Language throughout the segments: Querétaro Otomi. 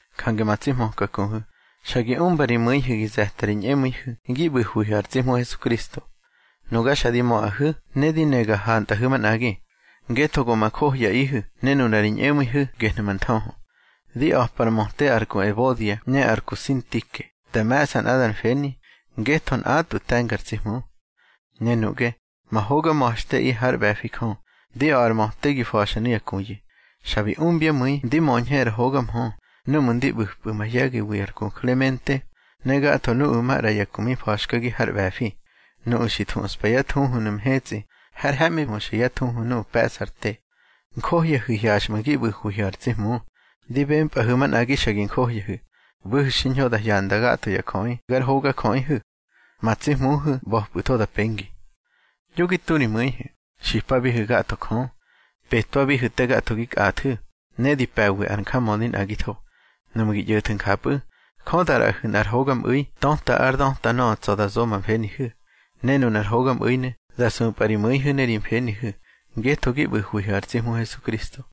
Jange ma tsi hmöka kuhu̱, xa gi umba ri mu̱ihu̱ gi ze̱ta ri ñꞌemu̱ihu̱ gi ꞌbu̱hwihu̱ ar tsi Hmu Hesukristo. Nuga xa di möꞌahu̱ ne di ne ga hantꞌahu̱ manꞌagi, ngetho go ma johyaꞌihu̱, ne nuna ri ñꞌemu̱ihu̱ gehnu̱ ma nthöhö. Di a̱pa ar möte ar ku Ebodia ne ar ku Sintike da me̱ꞌsa nꞌadar mfeni, ngetho nꞌatꞌwu̱ te̱nga ar tsi Hmu. Ne nuꞌge, ma hoga ma̱xteꞌi hár ꞌbe̱fi Jö, di a̱ꞌa ar möte gi fa̱xa nuya kuyu̱. Xa bi umbyá mu̱i ndi möñhe ar hoga mhö núꞌmu̱ ndi ꞌbu̱pꞌu̱ mahye̱giwi ar ku Klemente, ne gatho nuꞌu̱ maꞌra ya ku mi fa̱xkagi har ꞌbe̱fi. Nuꞌu̱ xi thuꞌspa yá thuhunu̱ mhetsꞌi har he̱ꞌmi huxa yá thuhu nuꞌu̱ pe̱ꞌsa ar te. Njohyahu̱ hyaxꞌmu̱ gi ꞌbu̱hwihu̱ ar tsi Hmu. Di bempꞌahu̱ manꞌagi xa gi njohyahu̱. ꞌBu̱hu̱ xiñho da hyanda gatho ya jöꞌi gar hogajöꞌihu̱. Ma tsi Hmuhu̱ ꞌba̱pꞌu̱tho da pengi. Yo gi tu ri mu̱ihu̱, xipabihu̱ gatho Jö. Petwabihu̱ te gatho gi kꞌathu̱, ne di pe̱wi ar njamödi nꞌagitho. Nuꞌmu̱ gi ꞌyo̱thu̱ njapꞌu̱, Jö da ꞌraꞌahu̱ nꞌar hogamꞌu̱i töta ár döta nöꞌö tsa̱ da zo ma mfenihu̱. Ne nunar hogamꞌu̱inu̱ da supꞌa ri mu̱ihu̱ ne ri mfenihu̱, ngetho gi ꞌbu̱hwihu̱ ar tsi Hmu Hesukristo.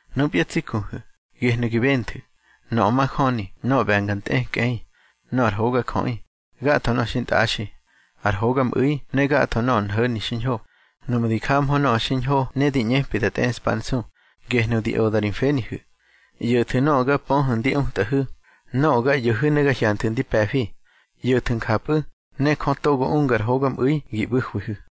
Nupya tsi kuhu̱, gehnu̱ gi benthu̱: nöꞌö majöni, nöꞌö ꞌbe̱nga ntꞌekꞌei, nöꞌö ar hogajöꞌi, gatho nöꞌö xintꞌaxi, ar hogamꞌu̱i ne gatho nöꞌö nho̱ni xiñho. Nuꞌmu̱ di jahmö nöꞌö xiñho ne di ꞌñepi da tꞌeꞌspa ár nsu, gehnu̱ di oda ri mfenihu̱. ꞌYo̱thu̱ nöꞌö ga pöhu̱ ndi utꞌahu̱, nöꞌö ga ꞌyo̱hu̱ ne ga hyanthu̱ ndi pe̱fi. ꞌYo̱thu̱ njapꞌu̱, ne Jö togo unga ar hogamꞌu̱i gi ꞌbu̱hwihu̱.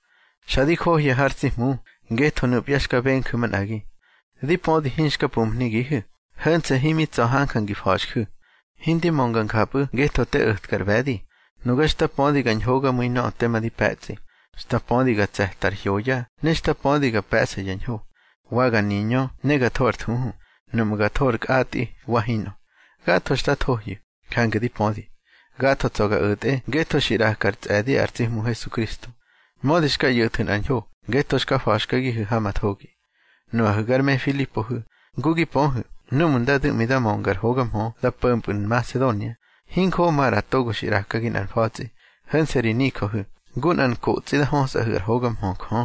Xa di johya har tsi Hmu, ngetho nupya xka benju̱ manꞌagi. Di pödi hinxka pumhnigihu̱, ho̱nse̱ himi tsa̱ hanja ngi fa̱xju̱. Hindi mönga njapꞌu̱ ngetho te o̱tkar ꞌbe̱di. Nuga xta pödi ga ñhogamu̱i nöꞌö tema di pe̱tsꞌi. Xta pödi ga tse̱ta ar hyoya ne xta pödi ga pe̱ꞌsa ya ñho, wa ga niñö ne ga tho ar thuhu, nuꞌmu̱ ga tho ar kꞌatꞌi wa hinꞌö. Gatho xta thohyu̱, jange di pödi. Gatho tsa̱ ga o̱tꞌe ngetho xi ꞌraka ar tsꞌe̱di ar tsi Hmu Hesukristo. Mödi xka ꞌyo̱thu̱ nꞌar ñho, ngetho xka fa̱xkagihu̱ ha ma thogi. Nuꞌahu̱ gar me Filipohu̱, ngu gi pöhu̱ núꞌmu̱ nda du̱ꞌmi da mönga ar hoga mhö nda po̱mpꞌu̱ Nmasedonia, hinjoꞌo maꞌra togo xi ꞌrakagi nꞌar mfa̱tsꞌi, ho̱nse̱ ri nijöhu̱, ngu nꞌar nkotsꞌi da hösꞌahu̱ ár hoga mhö Jö.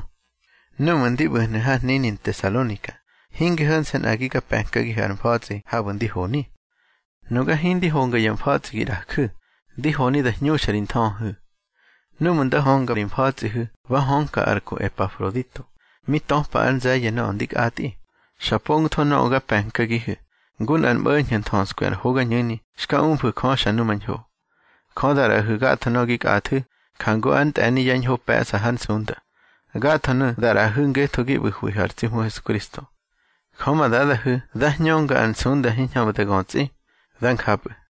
Núꞌmu̱ ndi ꞌbu̱hnu̱ har hnini Ntesalonika, hinge ho̱nse̱ nꞌagi ga pe̱nkagihu̱ ar mfa̱tsꞌi habu̱ ndi honi. Nuga hindi honga ya mfa̱tsꞌi gi ꞌraju̱. Di honi da hñuxa ri nthöhöhu̱. Núꞌmu̱ nda hönga ri mfa̱tsꞌihu̱ ba hönka ar ku Epafrodito, mi töpa ár nze̱ye̱ nöꞌö ndi kꞌatꞌi. Xa pongtho nöꞌö ga pe̱nkagihu̱, ngu nꞌar mꞌo̱ñho̱ nthöskwi ar hogañu̱ni xka umfu̱ Jö xa numañho. Jö da ꞌraꞌahu̱ gatho nöꞌö gi kꞌathu̱, jangu ár ntꞌe̱ni yá ñho pe̱ꞌsa hár nsunda. Gathonu̱ da ꞌraꞌahu̱ ngetho gi ꞌbu̱hwihu̱ ar tsi Hmu Hesukristo. Jö ma Dadahu̱ dá hñönga ar nsunda hiñhamꞌu̱ da götsꞌi. Dá njapꞌu̱.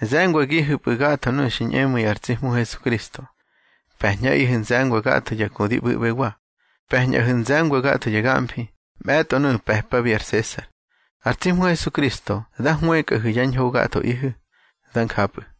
Ze̱ngwagihu̱pꞌu̱ gatho nuꞌu̱ xi ñꞌemu̱i ar tsi Hmu Hesukristo. Pe̱ñꞌaꞌihu̱ nze̱ngwa gatho ya ku di ꞌbu̱ꞌbewa. Pe̱ñꞌahu̱ nze̱ngwa gatho ya gamfi, mꞌe̱tꞌo nuꞌu̱ pe̱pabi ar Sesar. Ar tsi Hmu Hesukristo dá hwëkꞌahu̱ yá ñho gathoꞌihu̱. Dá njapꞌu̱.